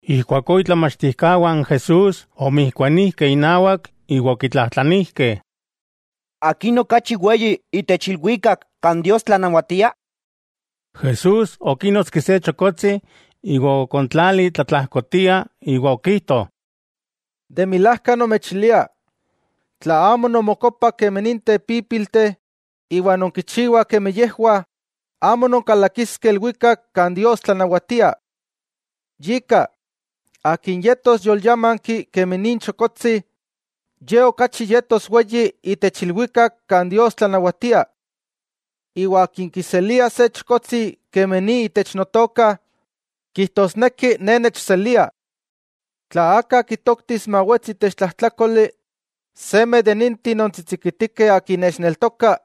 Ijkuakó itlamachtijkawah n Jesús omijkuanijkeh inawak, iwa okitlajtlanijkeh: —¿Akin okachi weyi itech ilwikak kan Dios tlanawatia? Jesús okínotski se chokotsi, iwa okontlali tlatlajkotia, iwa okijto: —De milajka nomechilia, tla amo nonmokopah kemi ninteh pípilteh iwa nonkichiwah kemi yejwah, amo nonkalakiskeh ilwikak kan Dios tlanawatia. Yika, akin yetos yolyámanki kemi nin chokotsi, ye okachi yetos weyi itech ilwikak kan Dios tlanawatia. Iwa akin kiselia se chokotsi kemi ni itech Notoka, kijtosneki Ne nechselia. 'Tla aka kitoktis mawetsi itech tlajtlákoli, seme de ninteh tsitsikitikeh akin nechneltokah,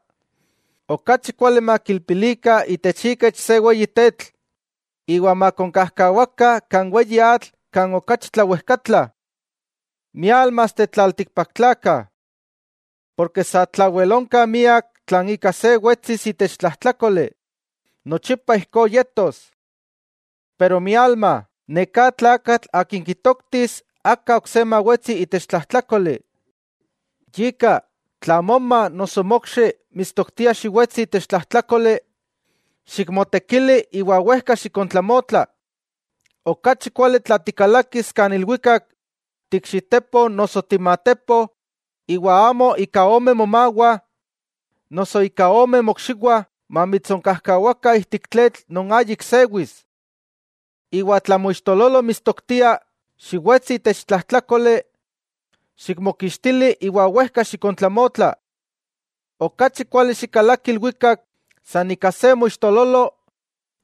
okachi kuali makilpilikah itech ikech se weyi tetl iwa makonkajkawakah kan weyi atl kan okachi tlawejkatla. ¡Miálmasteh tlaltikpaktlakah! Ken sa tlawel onka miak tlan ika se wetsis itech tlajtlákoli, nochipa ijkó yetos. Pero ¡mialma!, neká tlakatl akin kitoktis aka ok se mawetsi itech tlajtlákoli. 'Yika, tla moma noso mokxi mitstoktia xiwetsi itech tlajtlákoli, xikmotekili iwa wejka xikontlamotla. Okachi kuali tla tikalakis ilwikak tiikxitepo noso timatepo iwa amo ika ome momawah noso ika ome mokxiwah mamitsonkajkawakah ijtik tletl non ayik sewis. Iwa tla moixtololo mitstoktia xiwetsi itech tlajtlákoli, xikmokixtili iwa wejka xikontlamotla. Okachi kuali xikalaki ilwikak san ika se moixtololo,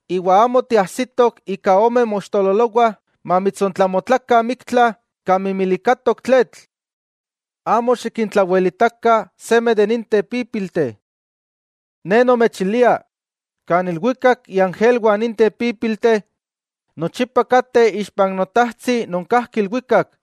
iwa amo tiajsitok ika ome moixtololowah mamitsontlamotlakah miktla kan mimilikatok tletl. 'Amo xikintlawelitakah seme de ninteh pípilteh. Ne nomechilia, kan ilwikak iangelwah ninteh pípilteh nochipa kateh ixpan Notajtsi non kajki ilwikak.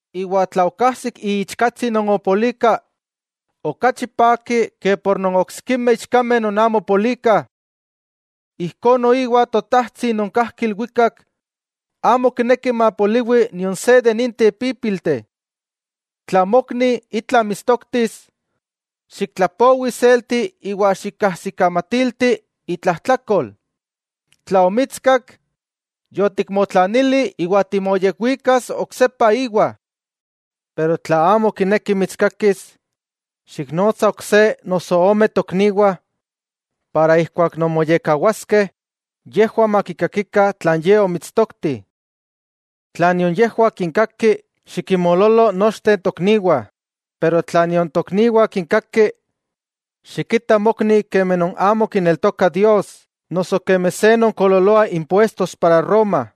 Iwa tla okajsik iichkatsi non opolika, okachi paki ke por non oksikimeh ichkameh non amo opolikah. Ijkó noiwa Totajtsi non kajki ilwikak amo kineki mapoliwi nion se de ninteh pípilteh. 'Tla mokni itla mitstoktis, xiktlapowi iselti iwa xikkajsikamatilti itlajtlakol. Tla omitskak, yotikmotlanili iwa timoyekwikas oksepa íwa. Pero tla amo kineki mitskakis, xiknotsa ok se noso ome tokniwah, iwa ijkuak non moyekkawaskeh yejwah makikakikah tlan ye omitstokti. Tla nion yejwah kinkaki, xikinmoololo nochteh n tokniwah, iwa tla nion tokniwah kinkaki, xikita mokni kemi non amo kineltoka Dios noso kemi se non koololoa impuestos para roma.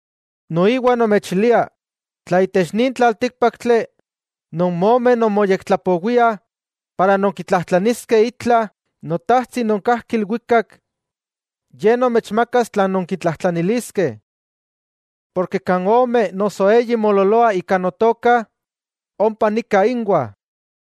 'Noiwa nomechilia: tla itech nin tlaltíkpaktli non momeh nonmoyektlapowiah para nonkitlajtlaniskeh itla Notajtsi non kajki ilwikak, Ye nomechmakas tlan nonkitlajtlaniliskeh. Porke kan ome noso eyi moololoah ika Notoka, ompa nika inwah.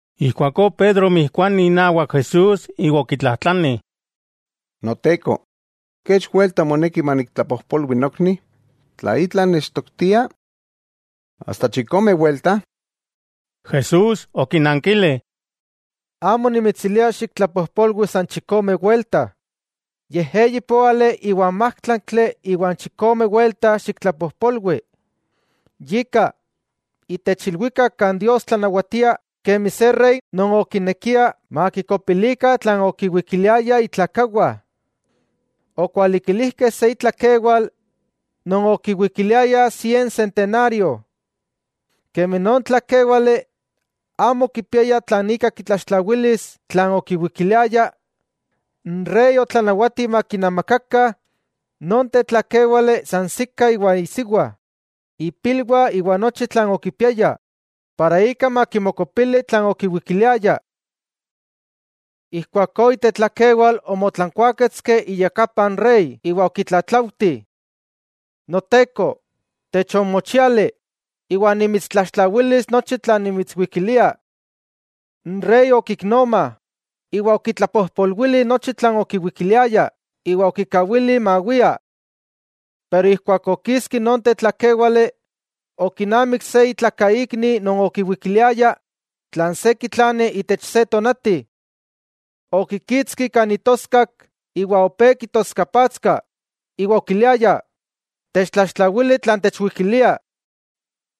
Ijkuakó Pedro omijkuani inawak Jesús iwa okitlajtlani: —Noteko, ¿kech welta moneki maniktlapojpolwi nokni, tla itla nechtoktia? ¿Asta chikome welta? Jesús okinankili: —Amo nimitsilia xiktlapojpolwi san chikome welta, yej eyipóali iwan májtlaktli iwa chikomeh welta xiktlapojpolwi. 'Yika, itech ilwikak kan Dios tlanawatia, kemi se rey, non okinekia makikopilikah tlan okiwikiliayah itlakawah. Okualikilijkeh se itlakewal non okiwikiliaya sien sentenario. Kemi non tlakéwale amo okipiaya tlan ika kitlaxtlawilis tlan okiwikiliaya, n rey otlanawati makinamakakah non tetlakéwale sansikah iwa isiwa, ipilwah iwa nochi tlan okipiaya para ika makimokopili tlan okiwikiliaya. Ijkuakó itetlakewal omotlankuaketski iyakapa n rey iwa okitlatlauti: “Noteko, techonmochiali iwa nimitstlaxtlawilis nochi tlan nimitswikilia.” N rey okiknoma, iwa okitlapojpolwili nochi tlan okiwikiliaya iwa okikawili mawia. Pero ijkuak okiski non tetlakéwale, okinamik se itlakaikni non okiwikiliaya tlan se kitlani itech se tonati. Okikitski kan itoskak iwa opé kitoskapatska iwa okiliaya: “¡Techtlaxtlawili tlan techwikilia!”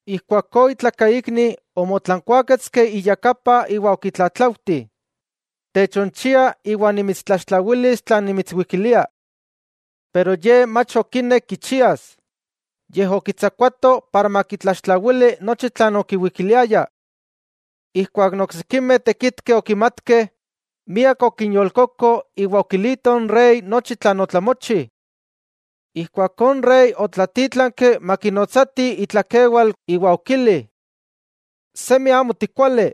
Ijkuakó itlakaikni omotlankuáketski iyakapa iwa okitlatlauti: “Techonchia iwa nimitstlaxtlawilis tlan nimitswikilia.” Pero ye mach okinek kichias, yej okitsakuato para makitlaxtlawili nochi tlan okiwikiliaya. Ijkuak n oksikimeh tekitkeh okimatkeh, miak okinyolkoko iwa okilitoh n rey nochi tlan otlamochi. Ijkuakó n rey otlatítlanki makinotsatih itlakewal iwa okili: “¡Semi amo tikuali!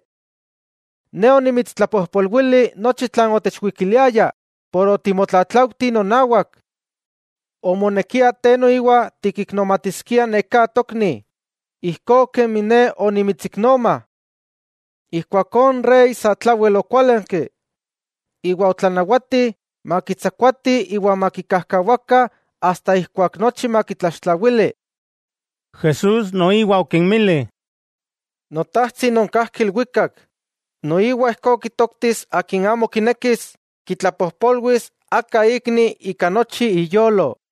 Ne onimitstlapojpolwili nochi tlan otechwikiliaya por otimotlatlauti nonawak. Omonekia te noiwa tikiknomatiskia neká tokni, ijkó kemi ne onimitsiknoma.” Ijkuakó n rey sa tlawel okuálanki, iwa otlanawati makitsakuatih iwa makikajkawakah asta ijkuak nochi makitlaxtlawili. Jesús noiwa okinmili: —Notajtsi non kajki ilwikak, noiwa ijkó kitoktis akin amo kinekis kitlapojpolwis aka ikni ika nochi iyolo.